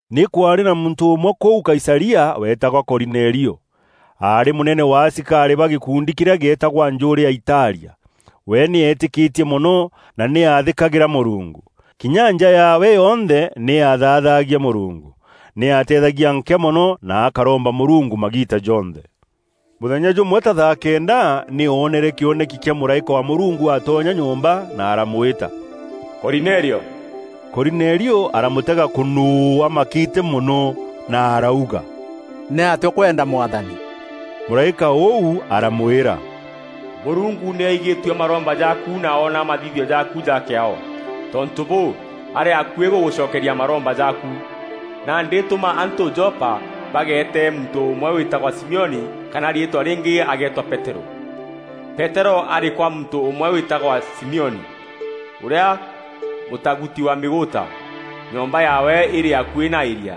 Nî kwaarî na muntû ûmwe kûu Kaisaria weetagwa Korinelio. Aarî mûnene wa asikarî ba gîkundi kîrîa gîetagwa Njûûrî ya Italia. We nî eetîkîtie mono na nî aathîkagîra Mûrungu. Kinya nja yaawe yonthe nî yathaathagia Mûrungu. Nî aateethagia nkîa mono na akaromba Mûrungu magiita jonthe. Mûthenya jûmwe ta thaa kenda nî oonere kîoneki kîa mûraîka wa Mûrungu atonya nyomba na aramwîta, “Korinelio!” Korinelio aramûtega kûnûû amakîte mono na arauga, “Nîatîa ûkwenda Mwathani?” Mûraîka ûu aramwîra, “Mûrungu nî aigîtue maromba jaaku na oona mathithio jaaku ja kîaao. Tontû bûû, arî akuî gûgûcokeria maromba jaaku. Nandî tûma antû Jopa bageete muntû ûmwe wîtagwa Simioni kana na riîtwa rîngî ageetwa Peterû. Peterû arî kwa muntû ûmwe wîtagwa Simioni, ûrîa mûtaguti wa mîgûûta. Nyomba yaawe îrî akuî na îria.”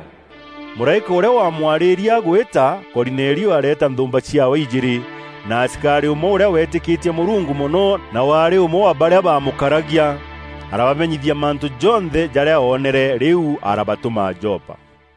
Mûraîka ûrîa wamwarîîrie agwîta, Korinelio areeta nthûûmba ciaawe ijîîrî, na asikarî ûmwe ûrîa weetîkîtie Mûrungu mono na waarî ûmwe wa barîa baamûkaragia. Arabamenyithia mantû jonthe jarîa oonere, rîu arabatûma Jopa.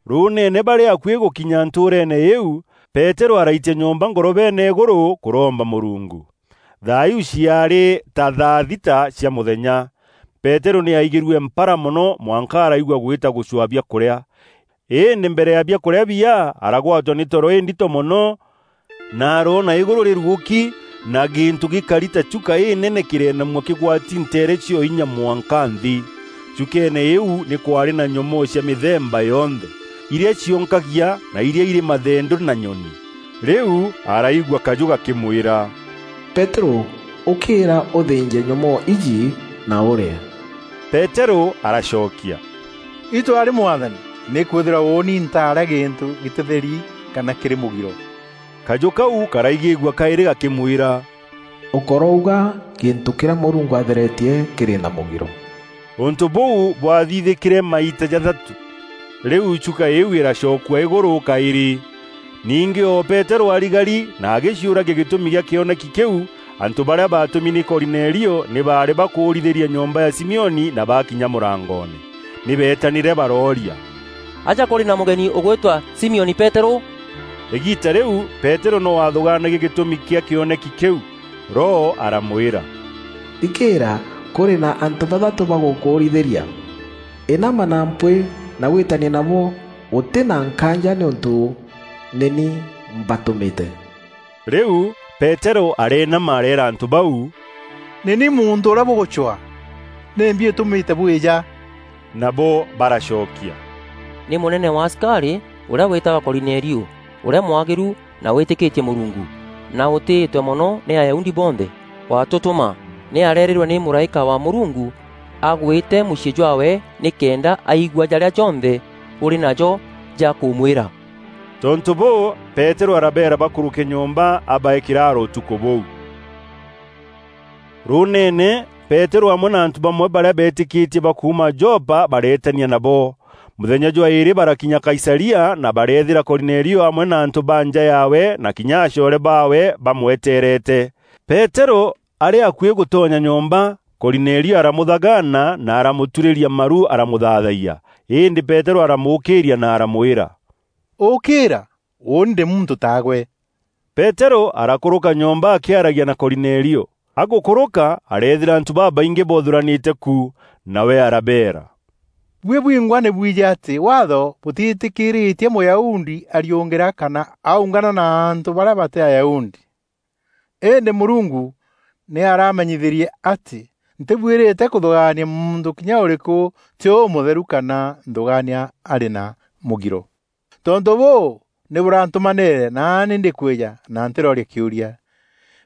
Rûûneene, barî akuî gûkinya ntûûreene îîu, Peterû araitia nyomba ngorobeene îgûrû kûromba Mûrungu. Thaa iu ciaarî ta thaa thita cia mûthenya. Peterû nî aigîrue mpara mono mwanka araigua gwîta gûcwaa biakûrîa. Îndî mbere ya biakûrîa biya, aragwatwa nî toro îndito mono na aroona îgûrû rîrugûki, na gîntû gîkari ta chuka înene kîreenamua kîgwati nteere cio inya mwanka nthî. Chukeene îîu, nî kwaarî na nyomoo cia mîthemba yonthe: irîa cionkagia na irîa irî mathendû na nyoni. Rîu araigua kajû gakîmwîra, “Peterû, ûkîîra ûthînje nyomoo iji na ûrîe!” Peterû aracokia, “Itû arî Mwathani! Nîkwîthîrwa ûûni ntaarîa gîntû gîtîtheri kana kîrî mûgiro.” Kajû kau karaigîîgua kaîrî gakîmwîra: “Ûkorouga gîntû kîrîa Mûrungu atheretie kîrî na mûgiro!” Ûntû bûu bwathithîkîre maita jathatû, rîu chuka îîu îracokua îgûrû kaîrî. Ningî o Peterû arigari na agîciûragia gîtûmi kîa kîoneki kîu, antû barîa baatûmi nî Korinelio, nî baarî bakûûrîthîria nyomba ya Simioni na bakinya mûrangoone. Nî beetanîre barooria, “Aja kûrî na mûgeni ûgwîtwa Simioni Peterû?” Îgiita rîu, Peterû no aathûgaanagia gîtûmi kîa kîoneki kîu. Roho aramwîra, “Thikîîra! Kûrî na antû bathatû bagûkûûrîthîria. Înama na mpwîî na wîîtanie nabo ûtî na nkaanja nîûntû nî ni mbatûmîte.” Rîu Peterû areenama areera antû bau, “Nî ni muntû ûrîa bûgûcwaa. Nîmbi îtûmîte bwîja?” Nabo baracokia, “Nî mûnene wa asikarî, ûrîa wîtagwa Korinelio, ûrîa mwagîru na wîîtîkîtie Mûrungu, na ûtîîtwe mono nî Ayahudi bonthe, watûtûma. Nî areerîrwe nî mûraîka wa Mûrungu agwîte mûciî jwaawe nîkenda aigua jarîa jonthe ûrî najo ja kûmwîra.” Tontû bûû, Peterû arabeera bakûrûke nyomba abaee kîraaro ûtukû bûu. Rûûneene, Peterû amwe na antû bamwe barîa beetîkîtie ba kuuma Jopa bareetania nabo. Mûthenya jwa îîrî barakinya Kaisaria na bareethîra Korinelio amwe na antû ba nja yaawe na kinya acoore baawe bamwetereete. Peterû arî akuî gûtonya nyomba, Korinelio aramûthagaana na aramûturîria maru aramûthaathayia. Îndî Peterû aramûûkîîria na aramwîra, “Ûkîîra, ûûni ndî muntû ta gwe.” Peterû arakûrûka nyomba akîaragia na Korinelio. Agûkûrûka areethîra antû babaingî boothûranîte ku. Nawe arabeera, “Buî bwingwa nî bwijî atî Waatho bûtîîtîkîritie Mûyahudi ariûngîra kana aungana na antû barîa batî Ayahudi. Îndî Mûrungu nî aramenyithîrie atî ntibuîrîte kûthûgaania muntû kinya ûrîkû tî ûmûtheru kana nthûgaania arî na mûgiro. Tontû bûû, nî bûrantûmanîîre naani ndîkwîja na ntîrooria kîûria.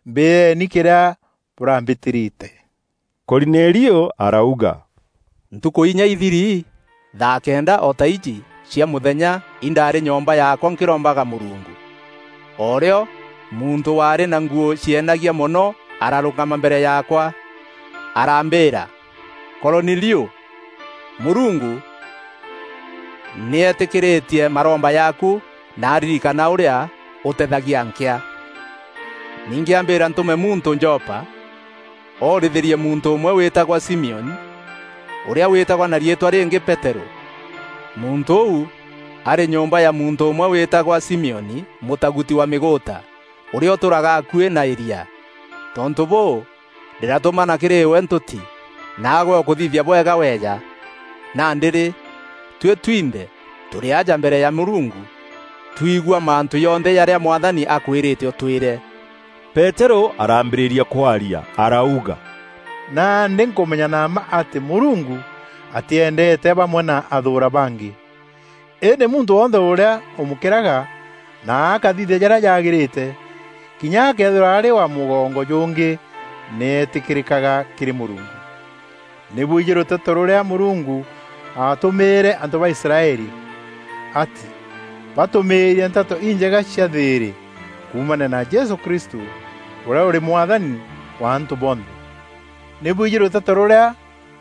Mbîîreeni kîrîa bûrambîtîrîte.” Korinelio arauga, “Ntukû inya ithiri, thaa kenda o ta iji cia mûthenya nî ndaarî nyomba yaakwa nkîrombaga Mûrungu. O rîo, muntû waarî na nguû cienagia mono ararûngama mbere yaakwa, arambîîra, ‘Korinelio! Mûrungu nî eetîkîîrîtie maromba jaaku na aririkana ûrîa ûteethagia nkîa. Ningî ambîra ntûme muntû Jopa, oorithîrie muntû ûmwe wîtagwa Simioni, ûrîa wîtagwa na riîtwa rîngî Peterû. Muntû ûu arî nyomba ya muntû ûmwe wîtagwa Simioni, mûtaguti wa mîgûûta, ûrîa ûtûûraga akuî na îria.’ Tontû bûû, ndîratûmana kîrî gwe ntûti, naagwe ûkûthithia bwega weeja. Nandî-rî, tuî twinthe tûrî aja mbere ya Mûrungu, twigua mantû jonthe jarîa Mwathani akwîrîte ûtwîre.” Peterû araambîrîria kwaria arauga: “Nandî nkûmenya na mma atî Mûrungu atîendeete bamwe na athûûra bangî. Îndî muntû wonthe ûrîa ûmûkîraga na akathithia jarîa jaagîrîte, kinya akeethîrwa arî wa mûgongo jûngî nî eetîkîrîkaga kîrî Mûrungu. Nî bwijî rûteto rûrîa Mûrungu aatûmîîre antû ba Israeli, atî batûmîîrie Nteto Injega cia thîîrî, kuumania na Jesû Kristû, ûrîa ûrî Mwathani wa antû bonthe. Nî bwijî rûteto rûrîa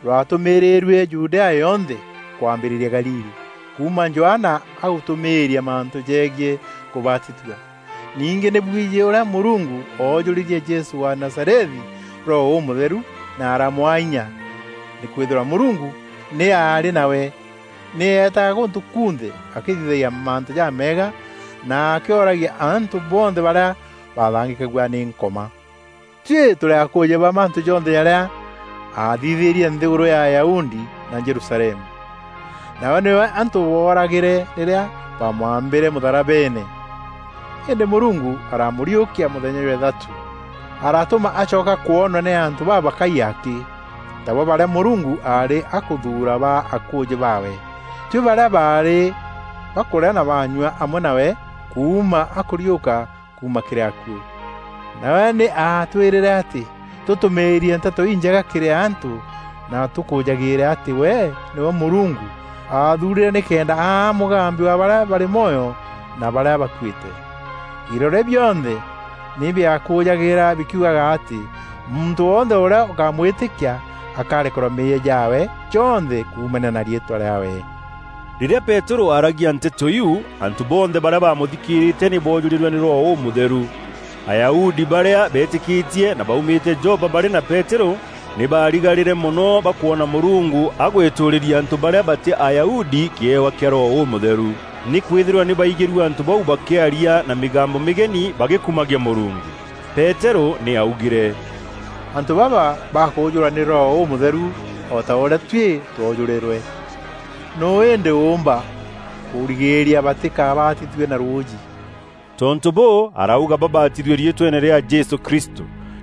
rwatumîîrîrue Judea yonthe kwambîrîria Galili, kuuma Johana agûtûmîîria mantû jegiî kûbatithua. Ningî nî bwijî ûrîa Mûrungu oojûrîrie Jesû wa Nazarethi Roho Ûmûtheru na aramwaa inya. Nîkwîthîrwa Mûrungu nî aarî nawe, nî eetaga gûntû kunthe akîthithagia mantû jameega na akîoragia antû bonthe barîa baathangîkagua nî Nkoma. Tuî tûrî akûûjî ba mantû jonthe jarîa aathithîrie nthîgûrû ya Ayahudi na Jerusalemu. Nawe nîwe antû booragîre rîrîa baamwambîre mûtharabeene. Îndî Mûrungu aramûriûkia mûthenya jwa îthatû, aratûma acoka kwonwa, nî antû babakaî akî, tabo barîa Mûrungu aarî akûthuura baa akûûjî baawe, tuî barîa baarî bakûrîa na baanyua amwe nawe kuuma akûriûka kuuma kîrî akuû. Nawe nî aatwîrîre atî tûtûmîîrie Nteto Injega kîrî antû na tûkûûjagîîre atî we nîwe Mûrungu aathuurîre nîkenda aa mûgambi wa barîa barî mwoyo na barîa bakuîte. Iroria bionthe nî biakûûjagîîra bikiugaga atî muntû wonthe ûrîa ûkamwîtîka akarekerwa meeyia jaawe jonthe kuumania na riîtwa rîaawe.” Rîrîa Peterû aaragia nteto iu, antû bonthe barîa baamûthikîîrîte nî boojûrîrwe nî Roho Ûmûtheru. Ayahudi barîa beetîkîtie na baumîte Jopa barî na Peterû, nî baarigarîre mono bakwona Mûrungu agwîtûûrîria antû barîa batî Ayahudi kîewa kîa Roho Ûmûtheru. Nîkwîthîrwa nî baaigîrue antû bau bakîaria na mîgambo mîgeni bagîkumagia Mûrungu Peterû nî aaugîre, “Antû baba bakûjûrwa nî Roho Ûmûtheru o ta ûrîa tuî twoojûrîrwe. Nûû îndî ûûmba kûrigîîria batîkabatithue na rûûjî?” Tontû bûû, arauga babatithue riîtweene rîa Jesû Kristû.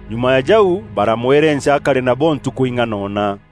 Nyuma ya jau baramwerenca akare nabo ntukû ing'anona.